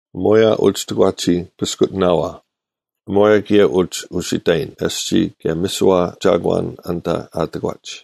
ᐊᒺᔭ ᐅᒋ ᑎᒂᒋ ᐱᔅᑯᑎᓇᐛ, ᐊᒺᔭ ᑭᔭ ᐅᒋ ᐅᓯᑕᔨᓐ ᐊᔅᒋᔾ ᑭᔭ ᒥᓯᐛ ᒐᒂᓐ ᐊᓐᑕ ᐊ ᑎᒂᒡ,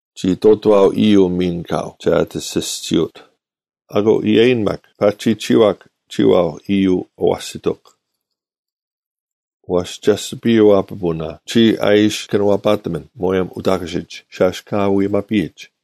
ᒋ ᐃᑐᑐᐛᐤ ᐃᔪᐤ ᒥᓐ ᑲᐤ ᒐ ᐊᑎ ᐊᓯᔅᒋᐅᑦ; ᐊᑯ ᐃᔭᔨᓐ ᒪᒃ, “ᐸᒋ ᒋᐛᒄ, ᒋᔨᐛᐤ ᐃᔪᐤ ᐊᐛᓯᑎᒄ᙮” ᐛᔅ ᒐᓯᐱᔪᐛ ᐱᐳᓇ ᒋᔾ ᐊ ᐃᓯ ᑭᓄᐛᐸᑎᒥᓐ ᒧᔭᒻ ᐅᑕᑯᓯᒡ, ᓴᔅ ᑲ ᐎᒪᐱᔨᒋ,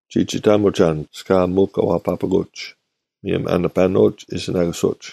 ᒋᒋᑕᒧᒐᓐ ᔅᑲ ᒥᒄ ᐊ ᐛᐸᐸᑯᒡ; ᒧᔭᒻ ᐊ ᓂᐸᓂᐅᒡ ᐃᓯᓇᑯᓯᐅᒡ: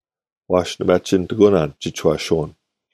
ᐛᔅ ᓂ ᒪᒋᓐᑎᑯᓇᓐ ᒋᒋᔄᓯᐅᓐ,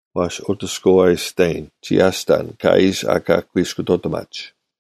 ᐛᔅ ᐅᑎᔅᑯᐤ ᐊ ᐃᑕᔨᓐ ᔅᒋ ᐊᔅᑕᓐ ᑲ ᐃᓯ ᐊᑲ ᑯᐃᔅᑯᑐᑎᒪᒡ,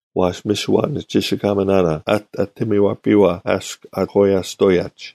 ᐛᔅ ᒥᓯᐛ ᓂᒋᓯᑲᒥᓇᓇ ᐊᑎ ᒥᔪᐛᐸᔨᐛ ᐊᔅᒄ ᐊ ᐊᐧᑯᔪᐛᓯᔅᑐᐅᔭᒡ;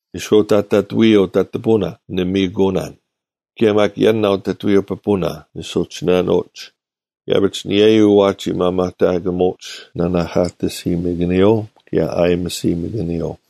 ᓂᔄᐅᑕᒡ ᑕᑐᔪᐤ ᑕᑐᐤ ᐱᐳᓇ ᓂ ᒥᔨᑯᐅᓇᓐ; ᑭᔭ ᒪᒃ ᔭᓇᐤ ᑕᑐᔪᐤ ᐱᐳᓇ ᓂ ᓱᒋᓯᓇᓂᐎᒡ; ᐃᔭᐱᒡ ᐊᓂᔭᔪᐤ ᐛᒋ ᒪᒪᑕᑯᒧᒡ ᓇᓇᐧᑲᑎᓯᒥᑭᓂᔪᐤ ᑭᔭ ᐊᔨᒥᓯᒥᑭᓂᔪᐤ;